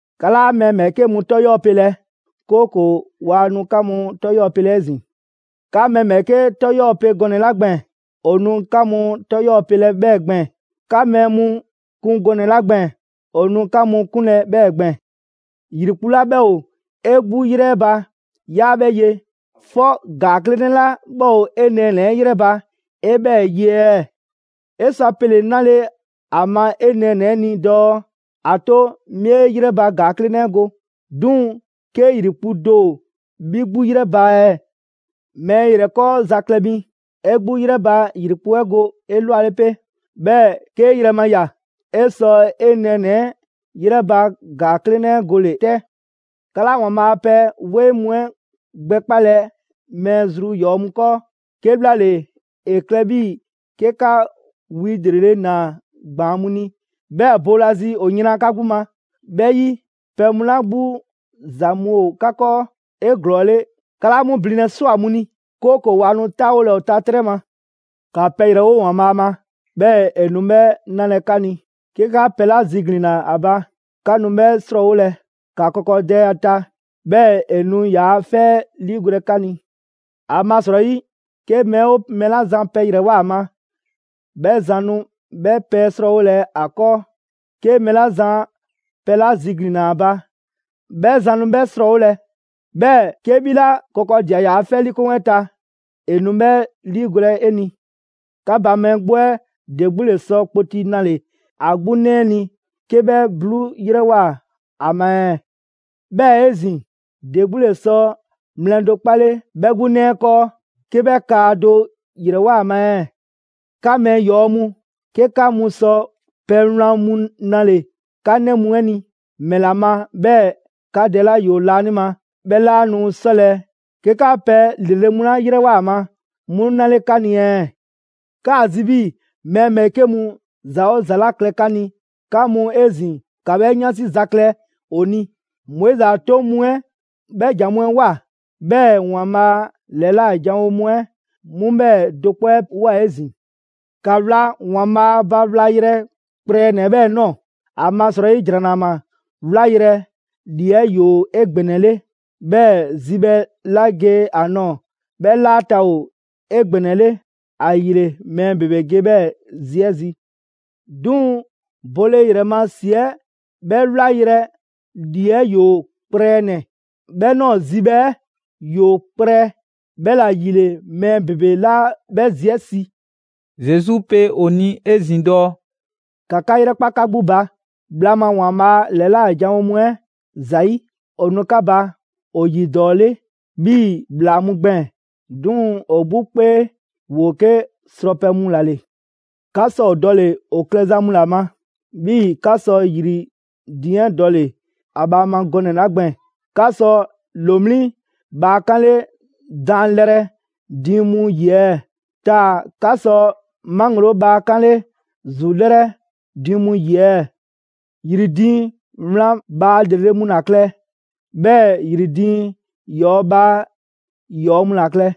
«'Ka 'laa mɛɛ ‑bhɛɛke' mu 'tɔ 'yɔɔ‑ pelɛ, 'kooko‑ waa nu 'ka mu 'tɔ 'yɔɔ‑ pelɛ 'ezin‑. 'Ka mɛɛ ‑bhɛɛke' 'tɔ 'yɔɔ‑ pe gɔnɛ‑ 'la gbɛɛn‑, ‑o nu 'ka mu 'tɔ 'yɔɔ‑ pelɛ 'bhɛɛ‑ gbɛɛn‑. 'Ka mɛɛ mu kun gɔnɛ‑ 'la gbɛɛn‑, ‑o nu 'ka mu 'kunlɛ‑ 'bhɛɛ‑ gbɛɛn‑. ‑Yrikpu' 'la 'bhɛ ‑o 'e 'gbu 'yrɛ 'ɛ ba 'yaa 'bhɛ ye, 'fɔ ‑gaa 'klenɛ 'la 'bhɛ ‑o 'e nɛɛnɛ‑ 'ɛ 'yrɛ 'ɛ ba 'e 'bhɛɛ‑ ye ɛɛ? 'E sɔ a pele‑ 'nale‑ ‑a ma 'e nɛɛnɛ‑ 'ɛ ni dɔɔ: ‹‑A 'to 'mi 'e 'yrɛ ba ‑gaa 'klenɛ 'ɛ go›. 'Duŋ‑ 'ke ‑yrikpu' do ‑o 'bhi 'gbu 'yrɛ 'ɛ ba ɛɛ? Mɛɛ ‑yrɛkɔɔza klɛ mi, 'e 'gbu 'yrɛ ba ‑yrikpu' 'ɛ go 'elwale 'pe, 'bhɛɛ‑ 'kee yrɛ ma ꞊ya, 'e sɔ 'e nɛɛnɛ‑ 'ɛ 'yrɛ ba ‑gaa 'klenɛ 'ɛ gole‑ 'tɛ.» «'Ka 'laa ‑Waanbhaa' a pɛ 'weŋ mu 'ɛ gbɛkpalɛ mɛɛ zru ‑yɔɔ' mu 'kɔɔ, 'kebhlaale, ‑e klɛ 'bhii‑ 'ke 'ka wi ‑lrele' ‑naa ‑gbaan' mu ni, 'bhɛɛ‑ boolazi ‑o yran 'ka 'gbu ma. 'Bhɛ 'yi, pɛ mu 'la 'gbu ‑za mu ‑o 'ka 'kɔɔ 'eglɔɔle 'ka 'laa 'mu blinlɛ ꞊swa mu ni, 'kooko‑ waa nu 'taawolɛ ‑o ta 'trɛ ma.» «‑Ka pɛ ‑yrɛwo' ‑Waanbhaa' ma, 'bhɛɛ‑ e nu 'bhɛ 'nalɛ‑ 'ka ni; 'ke 'ka pɛ 'la ziglinna ‑a ba, 'ka nu 'bhɛ 'srɔɔwolɛ. ‑Ka kɔkɔdɛ ‑a ta, 'bhɛɛ‑ ‑e nu ‑yaa' 'fɛ 'ɛ 'liigolɛ 'ka ni. ‑Amasrɔyi 'ke mɛɛ 'oo mɛɛ 'la zan pɛ ‑yrɛwoa ‑a ma, 'bhɛ zan nu 'bhɛ pɛ 'ɛ 'srɔɔwolɛ ‑a 'kɔɔ. 'Ke mɛɛ 'la zan pɛ 'la ziglinna ‑a ba, 'bhɛ zan nu 'bhɛ 'srɔɔwolɛ; 'bhɛɛ‑ 'ke 'bhi 'la kɔkɔdia ‑yaa' 'fɛ 'liikoŋ 'ɛ ta, ‑e nu 'bhɛ ‑liigolɛ 'e ni. 'Ka ba mɛɛ 'gbu 'ɛ ‑de 'gbu ‑le sɔ kpoti 'nale‑ ‑a 'gbu 'nɛ 'ɛ ni 'ke 'bhɛ 'bluu 'yrɛwoa‑ ‑a ma ɛɛ? 'Bhɛɛ‑ 'ezin‑, ‑de 'gbu ‑le sɔ mlɛ do 'kpale 'bhɛ 'gbu 'nɛ 'ɛ 'kɔɔ 'ke 'bhɛ kaa do ‑yrɛwoa ‑a ma ɛɛ? 'Ka mɛɛ ‑yɔɔ mu, 'ke 'ka mu sɔ pɛ wlan mu 'nale‑ 'ka 'nɛ mu 'ɛ ni, ‑mɛla ma 'bhɛɛ‑ 'ka Dɛ 'la ‑yoo laanima 'bhɛ 'laa nu 'sɔlɛ‑ 'ke 'ka pɛ ‑lrele' mu 'la ‑yrɛwoa ‑a ma 'mu 'nale‑ 'ka ni ɛɛ? 'Kaa‑ zi 'bhii‑ mɛɛ ‑bhɛɛke' mu ‑za 'oo ‑za 'la klɛ 'ka ni, 'ka mu 'ezin‑ ‑ka 'bhɛ 'yansi za klɛ ‑o ni. Moizi a 'toŋ mu 'ɛ 'bhɛɛ‑ ‑jan mu 'ɛ ꞊woa, 'bhɛɛ‑ ‑Waanbhaa' ‑lɛla' janwo mu 'ɛ 'mu 'bhɛɛ‑ do 'kpɔ 'ɛ ꞊woa 'ezin‑.» «‑Ka wla ‑Waanbhaa' ba wlayrɛ kprɛnɛ‑ 'ɛ 'bhɛɛ‑ ꞊nɔɔ. ‑Amasrɔyi ‑Jranama ['wlayrɛ‑] ‑lii 'ɛ ‑yoo 'egbɛnɛle; 'bhɛɛ‑ zibhɛ 'la ge ‑a ꞊nɔɔ, 'bhɛ ‑laata' ‑o 'egbɛnɛle. ‑Ayile mɛɛ ‑bebe ge 'bhɛɛ‑ zi 'ɛ zi. 'Duŋ‑ bole ‑yrɛ ma ‑si 'ɛ 'bhɛ 'wlayrɛ‑ ‑lii 'ɛ ‑yoo kprɛnɛ‑, 'bhɛ ꞊nɔɔ zibhɛ 'ɛ ‑yoo kprɛ; 'bhɛla‑ ‑yile mɛɛ ‑bebe 'laa 'bhɛ zi 'ɛ si.» Zesu pe ‑o ni 'ezin‑ dɔɔ: «‑Ka 'ka 'yrɛkpa 'ka 'gbu ba bhla ma ‑Waanbhaa' ‑lɛla' janwo mu 'ɛ ‑zayi'! ‑O nu 'ka ba ‑o ‑yi ‑dɔɔ 'le 'bhii‑ ‑bhlaa mu gbɛɛn‑, 'duŋ‑ ‑o 'gbu 'kpee, ‑woo 'ke srɔpɛ mu ‑la ‑le. 'Ka sɔ ‑o dɔle‑ ‑o klɛza mu ‑la ma; 'bhii‑ 'ka sɔ ‑yri diiŋ 'ɛ dɔle‑ ‑a bhaa ma gɔnɛ‑ 'la gbɛɛn‑. 'Ka sɔ ‑lomliŋ' bhaa 'kanle daanlɛrɛ diiŋ mu 'yi ɛɛ, taa‑ 'ka sɔ 'maŋgloo bhaa 'kanle ‑zulɛrɛ diiŋ mu 'yi ɛɛ? ‑Yri diiŋ wlan bhaa ‑lrele' mu ‑la klɛ, 'bhɛɛ‑ ‑yri diiŋ ‑yɔɔ' bhaa ‑yɔɔ' mu ‑la klɛ.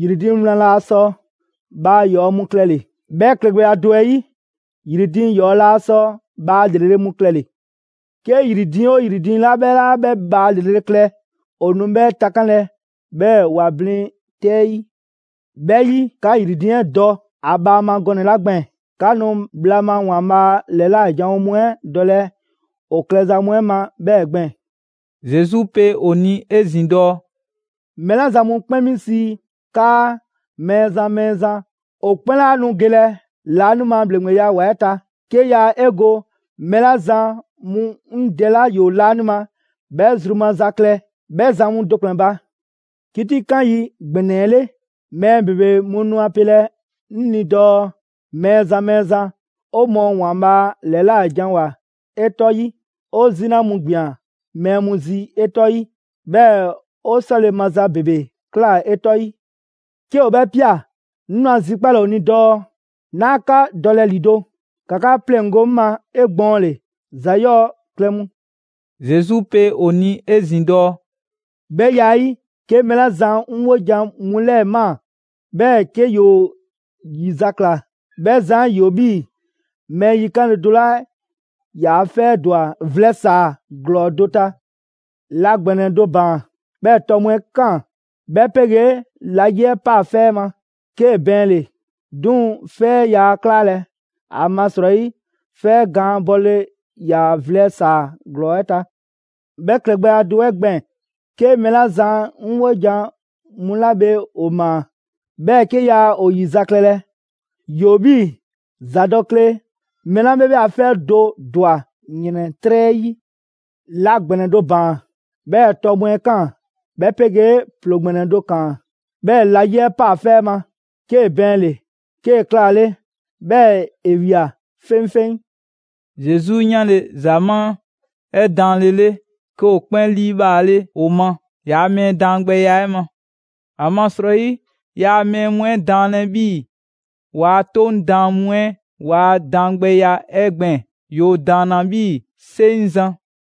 ‑Yri diiŋ wlan laa sɔ bhaa ‑yɔɔ' mu klɛle‑, 'bhɛ klɛgbɛya do 'ɛ 'yi, ‑yri diiŋ 'yɔɔ‑ laa sɔ bhaa ‑lrele' mu klɛle‑. 'Ke ‑yri diiŋ 'oo ‑yri diiŋ 'la 'bhɛ 'laa 'bhɛ bhaa ‑lrele' klɛ, ‑o nu 'bhɛ takanlɛ, 'bhɛɛ‑ ‑wa blin 'tɛ 'ɛ 'yi. 'Bhɛ 'yi, 'ka ‑yri diiŋ 'ɛ dɔ ‑a bhaa ma gɔnɛ‑ 'la gbɛɛn‑, 'ka nu bhla ma ‑Waanbhaa' ‑lɛla' janwo mu 'ɛ dɔlɛ ‑o klɛza mu 'ɛ ma 'bhɛɛ‑ gbɛɛn‑.» Zesu pe ‑o ni 'ezin‑ dɔɔ: «Mɛɛ 'la zan mu 'kpɛn 'mi sii 'kaa: ‹Mɛɛzan, Mɛɛzan›, ‑o 'kpɛn 'laa nu gelɛ laanima ‑bhleŋgbeya ‑wa 'ɛ ta; 'ke yaa 'e go mɛɛ 'la zan mu 'ŋ Dɛ 'la ‑yoo laanima 'bhɛ zru maza klɛ 'bhɛ zan mu do ‑kplɛn ba. 'Kitikan yi ‑gbɛnɛ 'ɛ 'le, mɛɛ ‑bebe mu nu a pelɛ 'ŋ ni dɔɔ: ‹Mɛɛzan, Mɛɛzan, 'o mɔɔ ‑Waanbhaa' ‑lɛlajanwoa 'e 'tɔ 'yi, 'o 'zina mu ‑gbian mɛɛ mu zi 'e 'tɔ 'ɛ 'yi, 'bhɛɛ‑ 'o 'sɔle‑ maza ‑bebe ꞊kla 'e 'tɔ 'ɛ 'yi.› 'Ke ‑o 'bhɛ ꞊pia, 'ŋ nu a zikpalɛ ‑o ni dɔɔ: ‹'Naa 'ka dɔlɛ ‑lido'; ‑ka 'ka 'pleŋgo‑ 'ŋ ma 'egbɔɔnle, ‑za 'yɔɔ‑ klɛ mu.›» Zesu pe ‑o ni 'ezin‑ dɔɔ: «'Bhɛ ya 'ɛ 'yi, 'ke mɛɛ 'la zan 'ŋ 'wojan‑ mu 'lɛɛ‑ ꞊maa, 'bhɛɛ‑ 'ke ‑yoo ‑yizakla, 'bhɛ zan 'ɛ ‑yoo 'bhii‑ mɛɛ yikanle do 'la ‑yaa' 'fɛ 'ɛ ‑dwa vlɛ ‑saa ‑glɔɔ do ta. La ‑gbɛnɛ do ‑baan, 'bhɛɛ‑ tɔ mu 'ɛ ꞊kaan, 'bhɛ 'pegee la 'yi 'ɛ paa 'fɛ 'ɛ ma 'kee‑ bɛɛnle‑; 'duŋ‑ 'fɛ 'ɛ yaa 'klalɛ‑; ‑amasrɔyi 'fɛ 'ɛ gaan bɔle ‑yaa vlɛ ‑saa ‑glɔɔ 'ɛ ta. 'Bhɛ klɛgbɛya do 'ɛ gbɛɛn‑, 'ke mɛɛ 'la zan 'ŋ 'wojan‑ mu 'la bhe ‑o ꞊maa, 'bhɛɛ‑ 'ke yaa ‑o ‑yizaklɛlɛ, ‑yoo 'bhii‑ ‑zadɔkle mɛɛ 'la 'bhɛ 'bhɛ a 'fɛ do ‑dwa ‑yrɛntrɛ' 'yi. La ‑gbɛnɛ do ‑baan, 'bhɛɛ‑ tɔ mu 'ɛ ꞊kaan, 'bhɛ 'pegee ‑ploo ‑gbɛnɛ do ‑kaan, 'bhɛɛ‑ la 'yi 'ɛ ꞊paa 'fɛ 'ɛ ma, 'kee‑ bɛɛnle‑, 'kee‑ 'klaale, 'bhɛɛ‑ ‑e ꞊wia 'feŋfeŋ.» Zesu 'yanle‑ ‑zamaa' 'ɛ daanlele, 'ke ‑o 'kpɛn 'liibhaale ‑o ma ‑yaa' mɛɛ daangbɛya 'ɛ ma. ‑Amasrɔyi yaa mɛɛ mu 'ɛ daanlɛ 'bhii‑ ‑waa' 'Toŋ daan mu 'ɛ ‑waa' daangbɛya 'ɛ gbɛɛn‑. ‑Yoo ‑daanna 'bhii‑ 'seŋzan‑.